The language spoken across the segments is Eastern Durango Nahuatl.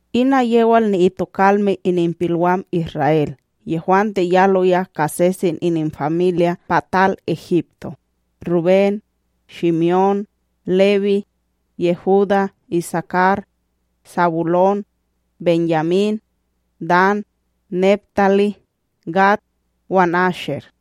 Ina yewal ni'itokalme ininpilwam Isra'El yehwante yaloya ka sesen ininfamilya' pa tal Egipto: Rubén, Shime'ón, Lewí, Yehudá, Isakar, Sabulón, Benyamín, Dan, Neptalí, Gad wan Asher.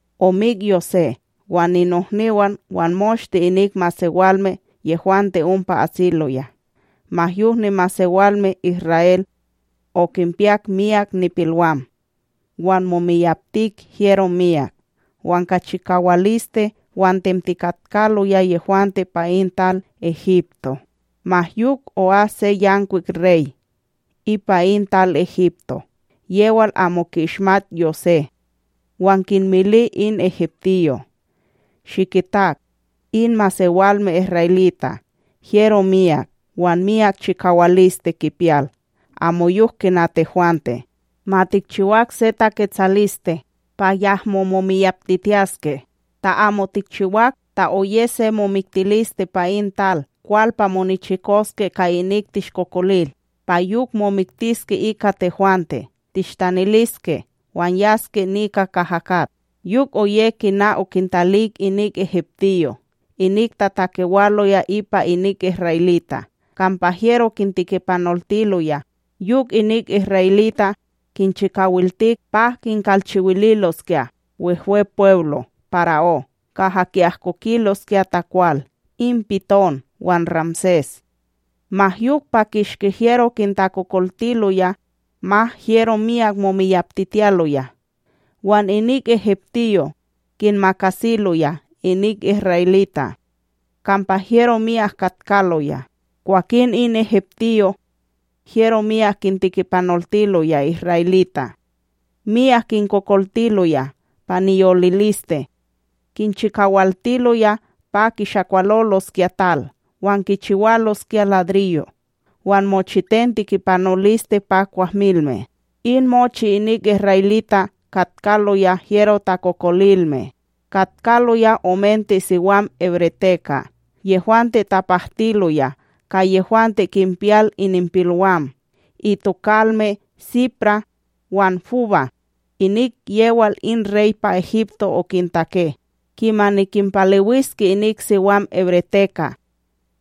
Omik Yosé wan ninohniwan wan moshte inik masewalme yehwante ompa asiloya. Ma yok nimasewalme Isra'El okinpiyak myak nipilwam wan momiyaptik hyero myak wan ka chikawaliste wan tentikatkaloya yehwante pa in tal Egipto. Ma yok o'as se yankwik rey ipa in tal Egipto yewal amo ki'ishmat Yosé, wan kinmili in egiptiyo': “Shikitak in masewalme isra'elita', hyero myak wan miyak chikawaliste kipiyal amoyok kina tehwante! Ma tikchiwak se taketsaliste pa yahmo momiyaptitiyaske. Ta amo tikchiwak, ta oye se momiktiliste pa in tal kwal pa monichikoske ka inik tishkokolil, pa yok momiktiske ika tehwante tishtaniliske wan yaske nika kaha kat.” Yok oye kina okintalik inik egiptiyo' inik tatakewaloya ipa inik isra'elita' kampa hyero kintekipanoltiloya. Yok inik isra'elita' kinchikawaltik pa kikalchiwililoskya Wehwepweblo para'ó kaha ki'ahkokiloskya takwal, in Piton wan Ramsés. Ma yok pa kishki hyero kintakokoltiloya, ma hyero myak momiyaptitiyaloya wan inik egiptiyo' kinmakasiloya inik isra'elita' kampa hyero myak katkaloya; kwakin in egiptiyo' hyero miyak kintekipanoltiloya isra'elita'. Miyak kinkokoltiloya pa niyoliliste, kinchiwaltiloya pa kishakwaloloskya tal wan kichiwaloskya ladriyo' wan mochiten tekipanoliste pa kwahmilme. In mochi inik isra'elita' katkaloya hyero takokolilme. Katkaloya omente siwam hebreteka' yehwante tapahtiloya ka yehwante kinpiyal ininpilwam, itokalme Siprá wan Pu'á, inik yewal in rey pa Egipto okintake: ―Kimani kinpalewiske inik siwam hebreteka'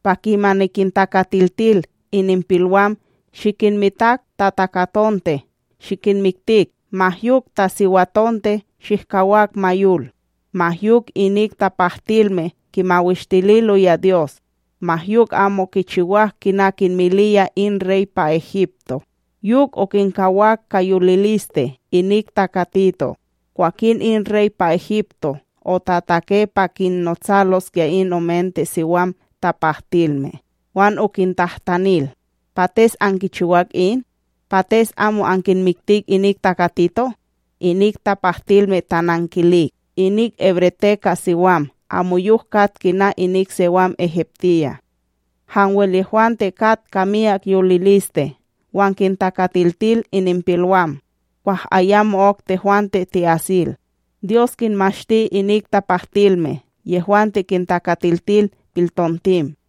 pa kimani kintakatiltil ininpilwam shikinmitak ta takatonte shihmiktik ma yok ta siwatonte shihkawak ma yol. Ma yok inik tapahtilme kimawishtililoya Dyos, ma yok amo kichiwak kina kinmiliyaya in rey pa Egipto, yok okinkawak ka yoliliste inik takatito'. Kwakin in rey pa Egipto otatake pa kinnotsaloskya in omente siwam tapahtilme wan okintahtanil: ―Pates ankichiwak in? Pates amo ankinmiktik inik takatito'? Inik tapahtilme tanankilik: ―Inik hebreteka' siwam amoyok kat kina inik siwam Egiptiya', hanwel yehwante kat ka miyak yoliliste wan kintakatiltil ininpilwam kwah ayamo'ok tehwante ti'asil. Dyos kinmashti inik tapahtilme yehwante kintakatiltil piltontim,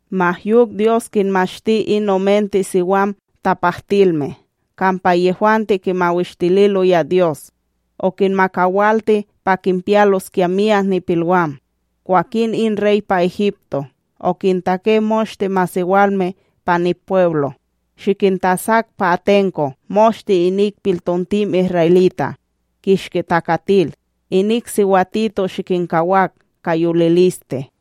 ma yok Dyos kinmashti in omente siwam tapahtilme kampa yehwante kimawishtililoya Dyos, okinmakawalti pa kinpiyaloskya myak nipilwam. Kwakin in rey pa Egipto okintake moshte masewalme pa nipweblo: ―Shikintasak pa atenko moshte inik piltontim isra'elita' kishki takatil! Inik siwatito shikinkawak ka yoliliste.